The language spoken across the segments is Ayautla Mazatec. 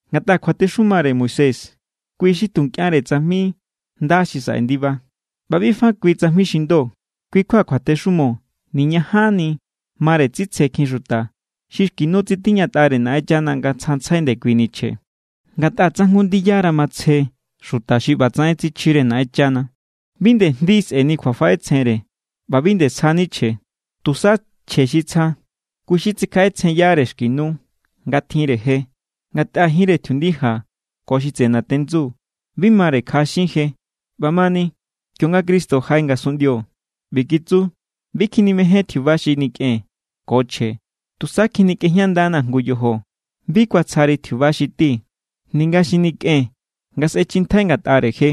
Ngatꞌa kjuatexumare Moisés, kui= xi tu nkꞌianre tsajmi nda xi saꞌe ndiba, ꞌba bi fa kui tsajmi xi ndo. Kui kjua kjuatexumo niñajanni mare tsitsjekjin xuta xi xki nu tsitiñatꞌare Naꞌenchana nga tsjantsjai ndekuini chje. Ngatꞌa tsa jngu ndiyara matsje xuta xi ꞌbatsaꞌen tsichjire Naꞌenchana, bi nde jndi sꞌe̱ni kjuafaꞌetsjenre ꞌba bi nde sjani chje. Tusa chje xi tsja, kui= xi tsikjaꞌetsjenyare xki nu nga tjinre je. Ngatꞌa jinre tjiundija ko xi tseꞌe natendsu bi mare kjaꞌaxin je. ꞌBamani, kionga Cristo jaꞌe ngasunꞌndio, ꞌbi kitsu: Bi kjinimején tjiuba xi nikꞌen ko chje. Tusa kikꞌejñandanaa̱ jngu yojo. Bi kuatsjari tjiuba xi ti, ninga xi nikꞌen nga sꞌechjintjai ngatꞌare je.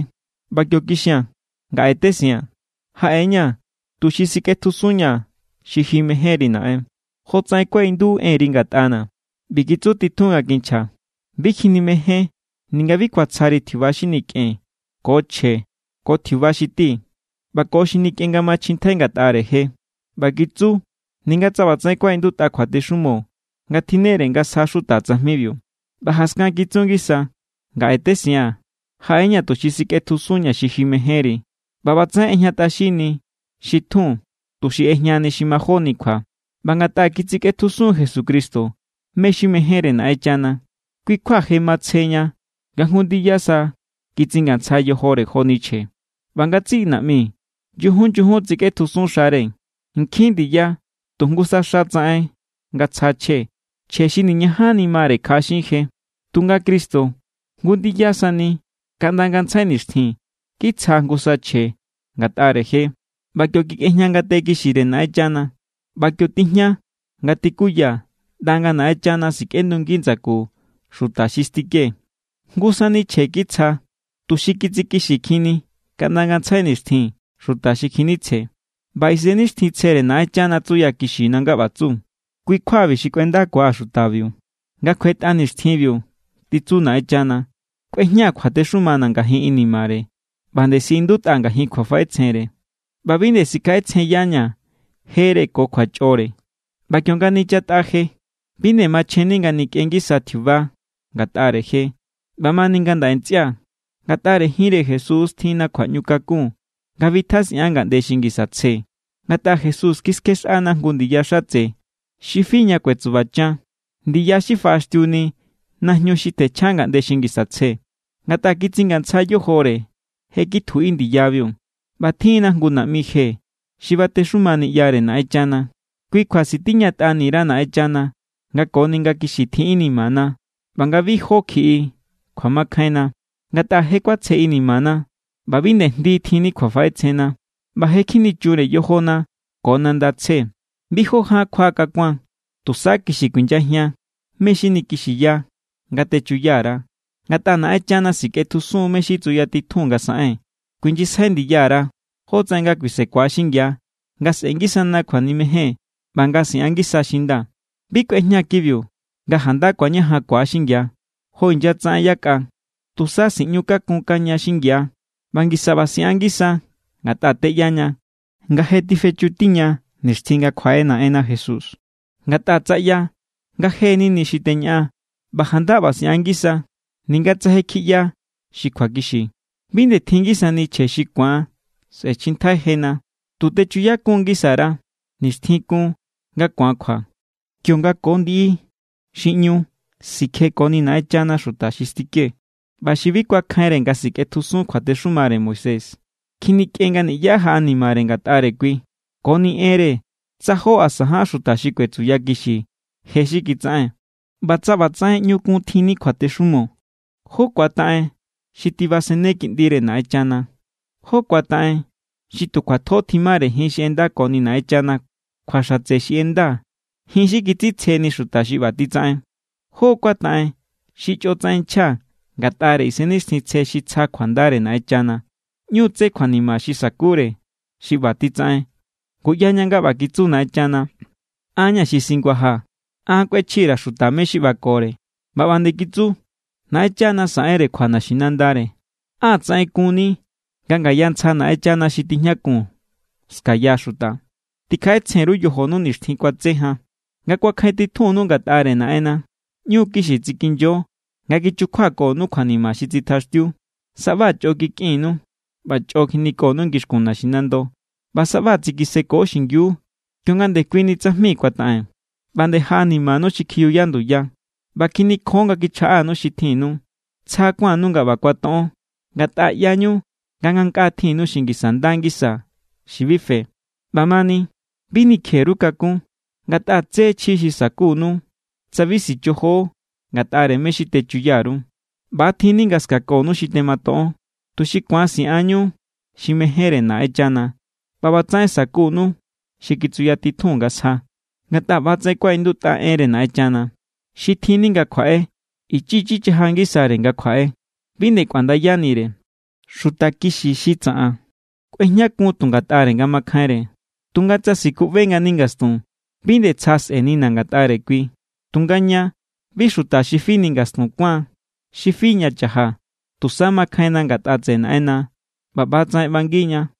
ꞌBa kio kixia̱n: “Ngaꞌe tesiaa̱n, jaꞌe=ña̱ tuxi sikꞌetjusunña̱ xi ji mejénri, Naꞌen, jotsaꞌen kuaꞌindutꞌa enri ngatꞌana̱.” ꞌBi kitsu titjun nga kinchja: “Bi kjinimején ninga bi kuatsjari tjiuba xi nikꞌen ko chje ko tjiuba xi ti ꞌba ko xi nikꞌen nga machjintjai ngatꞌare je.” ꞌBa kitsu, ninga tsa ꞌbatsaꞌen kuaꞌindutꞌa kjuatexumo nga tjinnere nga sja xuta tsajmibiu. ꞌBa jaskan kitsu ngisa: “Ngaꞌe tesiaa̱n. Jaꞌe=ña̱ tuxi sikꞌetjusunña̱ xi ji mejénri.” ꞌBa ꞌbatsaꞌen ꞌejñatꞌaxinni xi tjun, tuxi ꞌejñani xi majóni kjua. ꞌBa ngatꞌa kitsikꞌetjusun Jesucristo mé= xi mejénre Naꞌenchana, kui= kjua je matsjeña nga jngu ndiya sa kitsingantsja yojore joni chje. ꞌBa ngatsiꞌi naꞌmi nyujun nyujun tsikꞌetjusun xare. Nkjin ndiya tu jngusa xa tsaꞌen nga tsja chje, chje xi niñajanni mare kjaꞌaxin je. Tunga Cristo jngu ndiya sani kaꞌnda ngantsjai nixtjin kitsja jngu sa chje ngatꞌare je, ꞌba kio kikꞌejña ngate kixire Naꞌenchana. ꞌBa kio tijña nga tikuya ꞌnda nga Naꞌenchana sikꞌendungi ndsaku xuta xi stike. Jngu sani chje kitsja tuxi kitsikixikjinni kaꞌnda ngantsjai nixtjin xuta xi kjinitsje. ꞌBa Isennixtjintsjere Naꞌenchana tsuyakixina nga ꞌba tsu: Kui= kjuabi xi kꞌuendakua̱ xutabiu, nga kjuetꞌa nixtjinbiu, titsu Naꞌenchana. Kꞌuejñaa̱ kjuatexumana̱ ngajin inimare, ꞌba nde siꞌindutꞌa ngajin kjuafaꞌetsjenre. ꞌBa bi nde sikjaꞌetsjenyaña̱ jere ko kjuachꞌore. ꞌBa kionga nichatꞌa je, bi nde machjenni nga nikꞌen ngisa tjiuba ngatꞌare je. ꞌBamani ngandaꞌe ntsꞌia̱, ngatꞌare jinre Jesús= tjinna kjuaꞌñukakun nga bitjasꞌian ngaꞌnde xi ngisa tsje. Ngatꞌa Jesús kiskjexꞌana jngu ndiya xatse xi fi ña kuetsubachan, ndiya xi faꞌaxtiuni najñu xi tjenchja ngaꞌnde xi ngisa tsje. Ngatꞌa kitsingantsja yojore, je kitjuꞌi ndiyabiu. ꞌBa tjin=na jngu naꞌmi je xi batexuma niꞌyare Naꞌenchana. Kui kjua sitiñatꞌani_ra Naꞌenchana nga koni nga kixi tjin inimana ꞌba nga bi jó kjiꞌi kjuamakjainna. Ngatꞌa je kuatsje inimana ꞌba bi nde jndi tjinni kjuafaꞌetsjenna, ꞌba je kjinichunre yojona ko nanda tsje. Bi jó ján kjua kakuan. Tusa kixi kuinyajian mé= xi nikixiya nga techuya_ra, ngatꞌa Naꞌenchana sikꞌetjusun mé= xi tsuyatitjun nga saꞌen. kuinyisjai ndiya_ra jótsaꞌen nga kuisekua xingia nga sꞌe̱ngisana kjuanimejen ꞌba nga siꞌan ngisa xi nda. Bi kꞌuejña kibiu nga janda ku̱añajankua= xingia, jo inyatsaꞌen yakꞌa. Tusa siꞌñu kakunkaña xingia, ꞌba ngisa ꞌba siꞌan ngisa ngatꞌa teꞌyaña nga je tifechutiña nixtjin nga kjuaꞌe Naꞌenna Jesús. Ngatꞌa tsa ꞌya nga je nini xi teñaꞌan ꞌba janda ꞌba siꞌan ngisa, ninga tsa je kjiꞌya xi kjuakixi, bi nde tjinngi sani chje xi ku̱an sꞌe̱chjintjai jena. Tu techuyakun ngisa_ra nixtjin kun nga ku̱an kjua, kionga ko ndiꞌi xi ꞌñu sikjekoni Naꞌenchana xuta xi stike. ꞌBa xi bi kuakjainre nga sikꞌetjusun kjuatexumare Moisés, kjinikꞌen nga niꞌyá jaꞌanimare ngatꞌare kui, koni enre tsa jó asa ján xuta xi kuetsuyakixi je xi kitsaꞌen. ꞌBa tsa ꞌbatsaꞌen ꞌñu kun tjinni kjuatexumo, ¿jó= kuataꞌen xi tibasene Kiꞌndire Naꞌenchana? ¿Jó= kuataꞌen xi tu kjuatjo tjimare jin xi ꞌendakoni Naꞌenchana kjua xatse xi ꞌenda, jin xi kitsitsjeni xuta xi ꞌba titsaꞌen? ¿Jó= kuataꞌen xi chꞌotsaꞌen nchja ngatꞌare Isennixtjintsje xi tsja kjuandare Naꞌenchana? ꞌÑu= tse kjuanima xi sa̱kure xi ꞌba titsaꞌen. Ngu ꞌyaña nga ꞌba kitsu Naꞌenchana: “An= ña̱ xi singuajaa̱, an kꞌuechji_ra̱ xuta mé= xi ꞌbakore.” ꞌBa ꞌba nde kitsu: “Naꞌenchana saꞌenre kjua naxinandare.” ¡Á tsaꞌen kunni nga ngaya ntsja Naꞌenchana xi tijñakun ska̱ya xuta! Tikjaꞌetsjen_ru yojonu nixtjin kuatse jan, nga kuakjain titjunninu ngatꞌare Naꞌenna. ꞌÑu= kixi tsikinyo nga kichukjuakonu kjuanima xi tsitjaxtiu. Saꞌba chꞌo kikꞌinnu ꞌba chꞌo kjinikonu ngixkun naxinando, ꞌba saꞌba tsikiseko xingiu kionga ndekuini tsajmi kuataꞌen. ꞌBa nde jaꞌanimanu xi kjiyuya nduya, ꞌba kjinikjon nga kichjaꞌanu xi tjinnu. Tsja kuánnu nga ꞌba kuatoꞌon, ngatꞌa ꞌyañu nga ngankꞌaa tjinnu xi ngisa nda ngisa xi bi fe. ꞌBamani bi nikje_ru kakún, ngatꞌa tse chji xi sa̱kunu tsa bi sichojo ngatꞌare mé= xi techuya_ru. ꞌBa= tjinni nga ska̱konu xi tematoꞌon, tuxi ku̱an siꞌanñu xi mejénre Naꞌenchana ꞌba ꞌbatsaꞌen sa̱kunu xi kitsuyatitjun nga sja. Ngatꞌa ꞌbatsaꞌen kuaꞌindutꞌa enre Naꞌenchana: Xi tjinni nga kjuaꞌe ichi ichi chaja ngisare nga kjuaꞌe, bi nde kꞌuandayanire. Xuta kixi xi tsaꞌan kꞌuejñakun tu ngatꞌare nga makjainre. Tunga tsa sikuꞌbe ngani ngastun, bi nde tsja sꞌe̱nina̱ ngatꞌare kui. Tunga ña, bi xuta xi fini ngastun kuáan xi fi ña cha̱jaa̱. Tusa makjainna ngatꞌa tseꞌe Naꞌenna ꞌba ꞌbatsaꞌen ꞌbangiña.